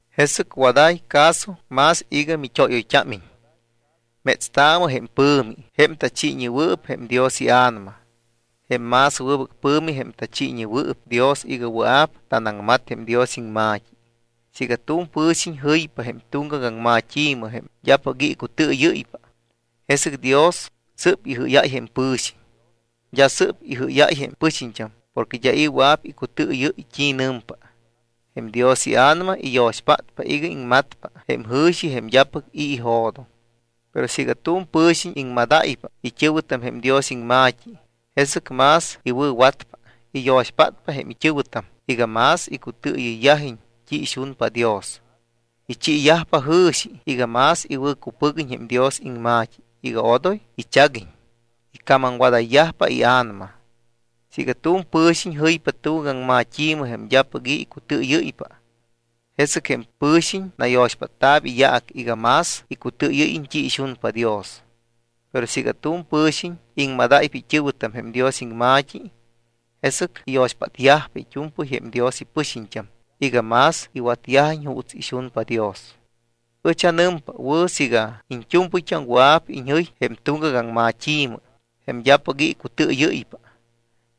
Jesɨc waday caso más iga mit́óyoyt́ámiñ. Metstaamɨ jém pɨ̱mi, jém tachiiñewɨɨp jém Dios iA̱nama. Jém más wɨbɨc pɨ̱mi jém tachiiñewɨɨp Dios iga wɨa̱p tanaŋmat jém Dios iŋma̱t́i. Siiga tu̱m pɨ̱xiñ jɨypa jém tuŋgac aŋmat́i̱mɨ, jém d́apɨc i̱ icutɨɨyɨ́ypa, jesɨc Dios sɨ́p ijɨ́yáy jém pɨ̱xiñ. D́a sɨ́p ijɨ́yáy jém pɨxiñt́am porque d́a i̱ wɨa̱p icutɨɨyɨ́y t́i nɨmpa. Jém Dios iA̱nama iyo̱xpátpa iga iŋmatpa jém jɨ̱xi jém d́apɨc i̱ ijo̱doŋ. Pero siiga tu̱m pɨ̱xiñ iŋmadáypa it́ɨ̱wɨtam jém Dios iŋma̱t́i, jesɨc más iwɨ̱watpa. Iyo̱xpátpa jém it́ɨ̱wɨtam iga más icutɨɨyɨyyajiñ t́i ixunpa Dios. Ichiiyajpa jɨ̱xi iga más iwɨ̱cupɨguiñ jém Dios iŋma̱t́i iga odoy ichaguiñ. Icamamwadayyajpa ia̱nama. Siiga tu̱m pɨ̱xiñ jɨypa tuŋgac aŋmat́i̱mɨ jém d́apɨc i̱ icutɨɨyɨ́ypa, jesɨc jém pɨ̱xiñ nayo̱xpátta̱p iyaac iga más icutɨɨyɨ́yiñ t́i ixunpa Dios. Pero siiga tu̱m pɨ̱xiñ iŋmadáypa it́ɨ̱wɨtam jém Dios iŋma̱t́i, jesɨc iyo̱xpátyajpa it́u̱mpɨy jém Dios ipɨxiñt́am iga más iwatyajiñ juuts ixunpa Dios. Ɨch anɨmpa wɨ̱ siiga iñt́u̱mpɨyt́am wɨa̱p iñjɨy jém tuŋgac aŋmat́i̱mɨ, jém d́apɨc i̱ icutɨɨyɨ́ypa.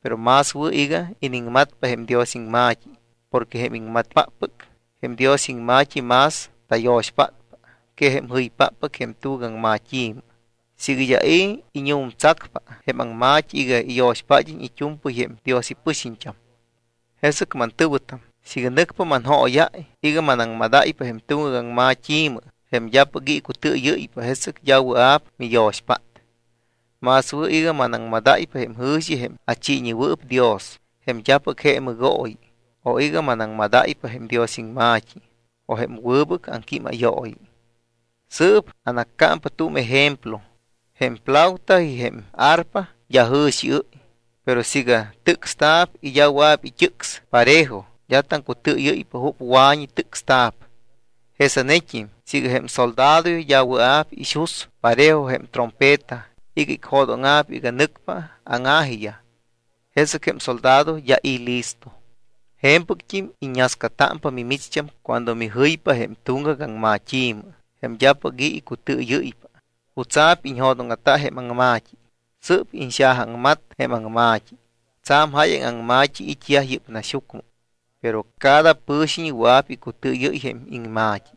Pero más wɨ̱ iga iniŋmatpa jém Dios iŋma̱t́i porque jém iŋmatpáppɨc jém Dios iŋma̱t́i más tayo̱xpátpa que jém jɨypáppɨc jém tuŋgac aŋmat́i̱mɨ siiga d́a i̱ iñu̱mtsacpa jém aŋma̱t́i iga iyo̱xpád́iñ it́u̱mpɨy jém Dios ipɨxiñt́am. Jesɨc, mantɨ̱wɨtam, siiga nɨcpa manjóyáy iga manaŋmadáypa jém tuŋgac aŋmat́i̱mɨ, jém d́apɨc i̱ icutɨɨyɨ́ypa, jesɨc d́a wɨa̱p miyo̱xpát. Más wɨ̱ iga manaŋmadáypa jém jɨ̱xi jém achiiñewɨɨp Dios, jém d́apɨc je mɨgooyi o iga manaŋmadáypa jém Dios iŋma̱t́i o jém wɨbɨc aŋquímayooyi. Sɨɨp anaccámpa tu̱m ejemplo. Jém flauta y jém arpa d́a jɨ̱xiɨ́y, pero siiga tɨcsta̱p y d́a wɨa̱p it́ɨcs parejo, d́a taŋcutɨɨyɨ́ypa jup wa̱ñi tɨcsta̱p. Jesanet́im siiga jém soldadoyaj d́a wɨa̱p ixus parejo jém trompeta iga icjo̱dóŋa̱p iga nɨcpa áŋa̱jiyaj, jesɨc jém soldado d́a i̱ listo. Je̱mpɨct́im iññascatámpa mimicht́am cuando mijɨypa jém tuŋgac aŋmat́i̱mɨ jém d́apɨc i̱ icutɨɨyɨ́ypa. ¿Jutsa̱p iñjo̱dóŋa̱ta jém aŋma̱t́i? Sɨ́p iñxajaaŋmat jém aŋma̱t́i. Tsa̱m jáyaŋ aŋma̱t́i it́yaj yɨ́p naxyucmɨ, pero cada pɨ̱xiñ wɨa̱p icutɨɨyɨ́y jém iŋma̱t́i.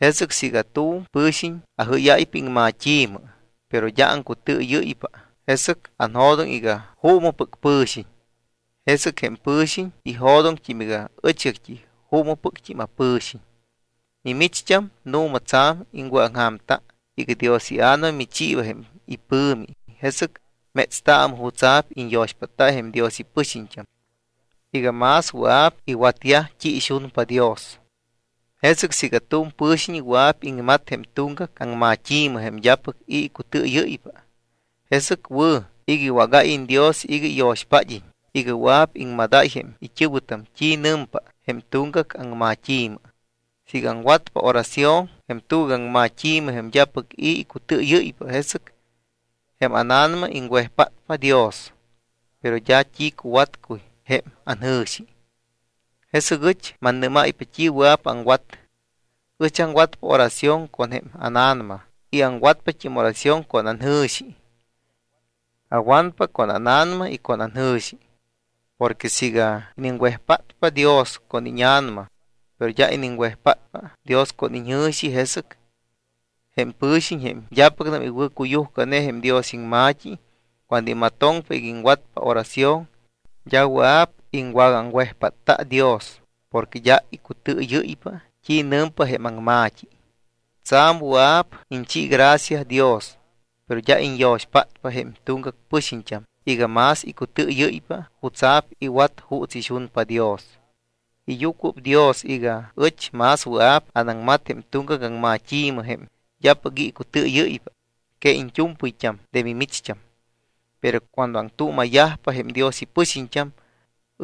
Jesɨc siiga tu̱m pɨ̱xiñ ajɨ́yáypa iŋmat́i̱mɨ, pero d́a aŋcutɨɨyɨ́ypa, jesɨc anjo̱doŋ iga juumɨpɨc pɨ̱xiñ. Jesɨc jém pɨ̱xiñ ijo̱doŋt́im iga ɨchgact́i juumɨpɨct́im apɨ̱xiñ. Mimicht́am, nu̱ma tsa̱m iŋwɨ̱aŋja̱mta iga Dios iA̱nama michiiba jém ipɨ̱mi, jesɨc métstaamɨ jutsa̱p iñyo̱xpátta jém Dios ipɨxiñt́am iga más wɨa̱p iwatyaj t́i ixunpa Dios. Jesɨc siiga tu̱m pɨ̱xiñ wɨa̱p iŋmat jém tuŋgac aŋmat́i̱mɨ, jém d́apɨc i̱ icutɨɨyɨ́ypa, jesɨc wɨ̱ iga iwágáyiñ Dios iga iyo̱xpád́iñ iga wɨa̱p iŋmadáy jém it́ɨ̱wɨtam t́i nɨmpa jém tuŋgac aŋmat́i̱mɨ. Siiga aŋwatpa oración jém tuŋgac aŋmat́i̱mɨ, jém d́apɨc i̱ icutɨɨyɨ́ypa, jesɨc jém ána̱nama iŋwejpátpa Dios, pero d́a t́i cuwatcuy jém anjɨ̱xi. Jesɨc ɨch mannɨ́máypa t́i wɨa̱p aŋwat. Ɨch aŋwatpa oración con jém ána̱nama y aŋwatpat́im oración con anjɨ̱xi. Awanpa con ána̱nama y con anjɨ̱xi. Porque siiga iniŋwejpátpa Dios con íña̱nama, pero d́a iniŋwejpátpa Dios con iñjɨ̱xi, jesɨc jém pɨ̱xiñ jém d́apɨcnam iwɨ̱cuyujcane jém Dios iŋma̱t́i, cuando imatoŋpa iga iŋwatpa oración, d́a wɨa̱p iŋwagaaŋwejpátta Dios porque d́a icutɨɨyɨ́ypa t́i nɨmpa jém aŋma̱t́i. Tsa̱m wɨa̱p iñchi gracia Dios, pero d́a iñyo̱xpátpa jém tuŋgac pɨxiñt́am iga más icutɨɨyɨ́ypa jutsa̱p iwat juuts ixunpa Dios. Iyucuɨpdios iga ɨch más wɨa̱p anaŋmat jém tuŋgac aŋmat́i̱mɨ, jém d́apɨc i̱ icutɨɨyɨ́ypa, que iñt́u̱mpɨyt́am de mimicht́am. Pero cuando aŋtuuma̱yajpa jém Dios ipɨxiñt́am,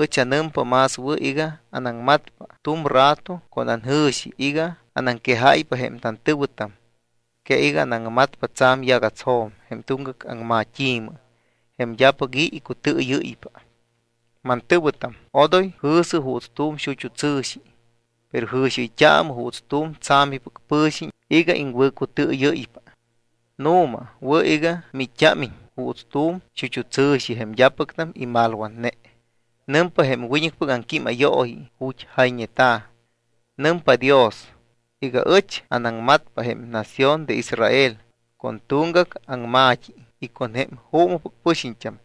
ɨch anɨmpa más wɨ̱ iga anaŋmatpa tu̱m rato con anjɨ̱xi iga anaŋquejáypa jém tantɨ̱wɨtam que iga anaŋmatpa tsa̱m yagatsjo̱m jém tuŋgac aŋmat́i̱mɨ jém d́apɨc i̱ icutɨɨyɨ́ypa. Mantɨ̱wɨtam, odoy jɨ̱sɨ juuts tu̱m xut́u tsɨ̱xi. Pero jɨ̱xiɨyt́aamɨ juuts tu̱m tsa̱mipɨc pɨ̱xiñ iga iŋwɨ̱cutɨɨyɨ́ypa. Nu̱ma wɨ̱ iga miit́t́ámiñ juuts tu̱m xut́u tsɨ̱xi, jém d́apɨcnam imalwatne. Nɨmpa jém wiñɨcpɨc aŋquímayooyi ju̱t́ jayñeta̱: “Nɨmpa Dios iga ɨch anaŋmatpa jém nación de Israel con tuŋgac aŋma̱t́i y con jém juumɨpɨc pɨxiñt́am.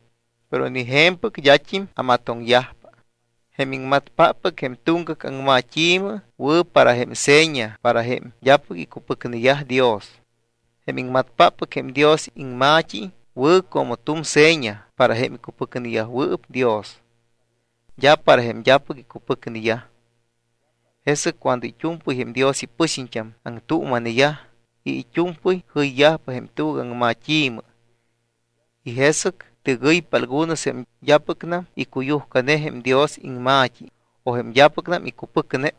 Pero ni je̱mpɨc d́at́im amatoŋyajpa.” Jém iŋmatpáppɨc jém tuŋgac aŋmat́i̱mɨ wɨ̱ para jém seña para jém d́apɨc icupɨcneyaj Dios. Jém iŋmatpáppɨc jém Dios iŋma̱t́i wɨ̱ como tu̱m seña para jém icupɨcneyajwɨɨp Dios. D́a para jém d́apɨc icupɨcneyaj. Jesɨc cuando it́u̱mpɨy jém Dios ipɨxiñt́am aŋtuuma̱neyaj y it́u̱mpɨy jɨyyajpa jém tuŋgac aŋmat́i̱mɨ y jesɨc tɨgɨypa algunos jém d́apɨcnam icuyujcane jém Dios iŋma̱t́i o jém d́apɨcnam icupɨcne,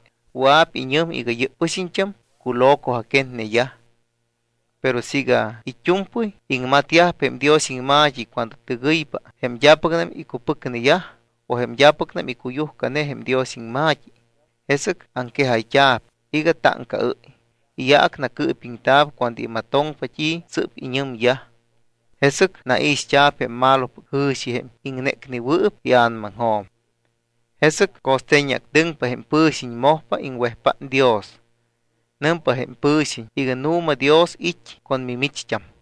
wɨa̱p iñɨm iga yɨ́p pɨxiñt́am culo̱coa̱quetneyaj. Pero siiga it́u̱mpɨy iŋmatyajpa jém Dios iŋma̱t́i cuando tɨgɨypa jém d́apɨcnam icupɨcneyaj o jém d́apɨcnam icuyujcane jém Dios iŋma̱t́i, jesɨc aŋquejayt́a̱p iga táŋcaɨ́y, iyaac nacɨɨpiŋta̱p cuando imatoŋpa t́i sɨ́p iñɨmyaj. Jesɨc naixt́a̱p jém malopɨc jɨ̱xi jém iŋnécnewɨɨp ia̱namaŋjo̱m. Jesɨc co̱ste̱ñactɨŋpa jém pɨ̱xiñ, mojpa iŋwejpát Dios. Nɨmpa jém pɨ̱xiñ iga nu̱ma Dios it́ con mimicht́am.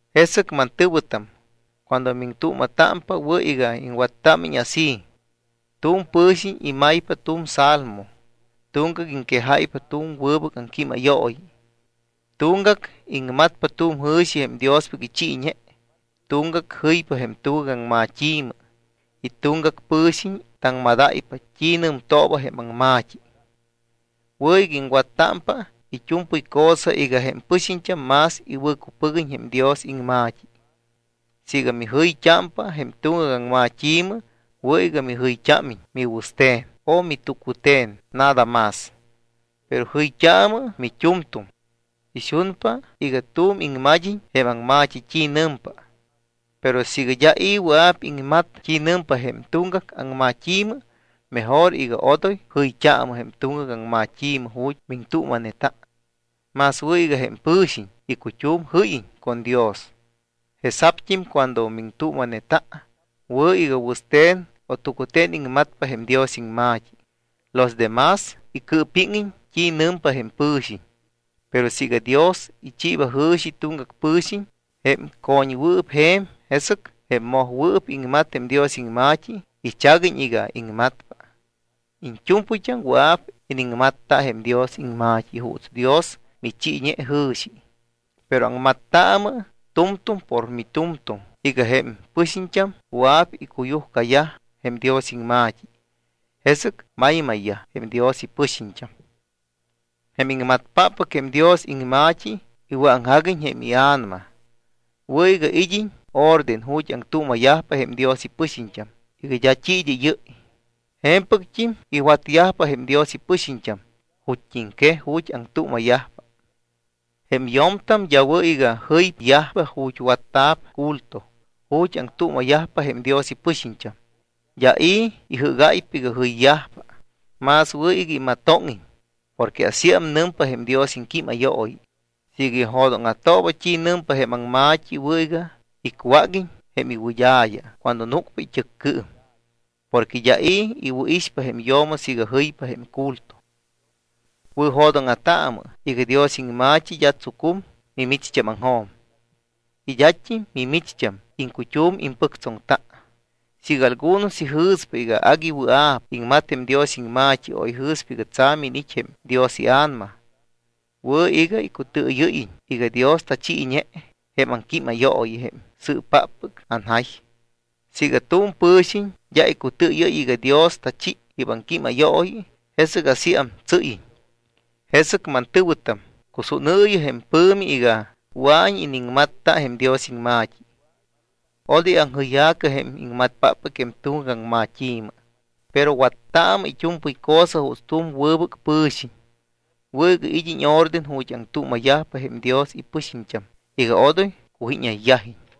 Jesɨc, mantɨ̱wɨtam, cuando miŋtuuma̱támpa, wɨ̱ iga iŋwattámiñ así: Tu̱m pɨ̱xiñ imaypa tu̱m salmo, tuŋgac iŋquejáypa tu̱m wɨbɨc aŋquímayooyi, tuŋgac iŋmatpa tu̱m jɨ̱xi jém Diospɨc ichiiñe, tuŋgac jɨypa jém tuŋgac aŋmat́i̱mɨ, y tuŋgac pɨ̱xiñ taŋmadáypa t́i nɨmtooba jém aŋma̱t́i. Wɨ̱ iga iŋwattámpa it́u̱mpɨy cosa iga jém pɨxiñt́am más iwɨ̱cupɨguiñ jém Dios iŋma̱t́i. Siiga mijɨyt́ámpa jém tuŋgac aŋmat́i̱mɨ, wɨ̱ iga mijɨyt́ámiñ miwɨste̱n o mit́ucute̱n nada más. Pero jɨyt́aamɨ mit́u̱mtu̱m. Ixunpa iga tu̱m iŋmad́iñ jém aŋma̱t́i t́i nɨmpa. Pero siiga d́a i̱ wɨa̱p iŋmat t́i nɨmpa jém tuŋgac aŋmat́i̱mɨ, mejor iga odoy jɨyt́aamɨ jém tuŋgac aŋmat́i̱mɨ ju̱t́ miŋtuuma̱neta. Más wɨ̱ iga jém pɨ̱xiñ icut́um jɨ́yiñ con Dios. Jesa̱pt́im cuando miŋtuuma̱neta, wɨ̱ iga wɨste̱n o tucute̱n iŋmatpa jém Dios iŋma̱t́i. Los de más icɨɨpíŋiñ t́i nɨmpa jém pɨ̱xiñ. Pero siiga Dios ichiiba jɨ̱xi tuŋgac pɨ̱xiñ, jém co̱ñwɨɨp je̱m, jesɨc jém mojwɨɨp iŋmat jém Dios iŋma̱t́i ichaguiñ iga iŋmatpa. Iñt́u̱mpɨyt́am wɨa̱p iniŋmatta jém Dios iŋma̱t́i juuts Dios michiiñe jɨ̱xi. Pero aŋmattaamɨ tu̱mtu̱m por mit́u̱mtu̱m iga jém pɨxiñt́am wɨa̱p icuyujcayaj jém Dios iŋma̱t́i, jesɨc maymayyaj jém Dios ipɨxiñt́am. Jém iŋmatpáppɨc jém Dios iŋma̱t́i iwɨ̱aŋjaguiñ jém ia̱nama. Wɨ̱ iga id́iñ orden ju̱t́ aŋtuuma̱yajpa jém Dios ipɨxiñt́am iga d́a t́i id́ɨ́yɨ́y. Je̱mpɨct́im iwatyajpa jém Dios ipɨxiñt́am ju̱t́iŋquej ju̱t́ aŋtuuma̱yajpa. Jém yo̱mtam d́a wɨ̱ iga jɨyyajpa ju̱t́ watta̱p culto ju̱t́ aŋtuuma̱yajpa jém Dios ipɨxiñt́am. D́a i̱ ijɨ́gáypa iga jɨyyajpa. Más wɨ̱ iga imatóŋiñ porque asíam nɨmpa jém Dios iŋquímayooyi. Siiga ijo̱dóŋa̱tooba t́i nɨmpa jém aŋma̱t́i, wɨ̱ iga icwáguiñ jém iwɨd́a̱ya cuando núcpa it́ɨccɨɨm. Porque d́a i̱ iwɨ̱ixpa jém yo̱mo siiga jɨypa jém culto. Wɨ̱jo̱dóŋa̱taamɨ iga Dios iŋma̱t́i d́a tsucum mimicht́ámaŋjo̱m. Y d́at́im mimicht́am iŋcut́um impɨctsoŋta. Siiga algunos ijɨ̱spa iga agui wɨa̱p iŋmat jém Dios iŋma̱t́i o ijɨ̱spa iga tsa̱m iniit́ jém Dios iA̱nama, wɨ̱ iga icutɨɨyɨ́yiñ iga Dios tachiiñe jém aŋquímayooyi jém sɨ́ppáppɨc anjay. Siiga tu̱m pɨ̱xiñ d́a icutɨɨyɨ́y iga Dios tachi yɨ́p aŋquímayooyi, jesɨc asíam tsɨ́yiñ. Jesɨc, mantɨ̱wɨtam, cusúnɨɨyɨ jém pɨ̱mi iga wɨa̱iñ iniŋmatta jém Dios iŋma̱t́i. Odoy aŋjɨyja̱cɨ jém iŋmatpáppɨc jém tuŋgac aŋmat́i̱mɨ. Pero wattaamɨ it́u̱mpɨy cosa juuts tu̱m wɨbɨc pɨ̱xiñ. Wɨ̱ iga id́iñ orden ju̱t́ aŋtuuma̱yajpa jém Dios ipɨxiñt́am iga odoy cujíñayyajiñ.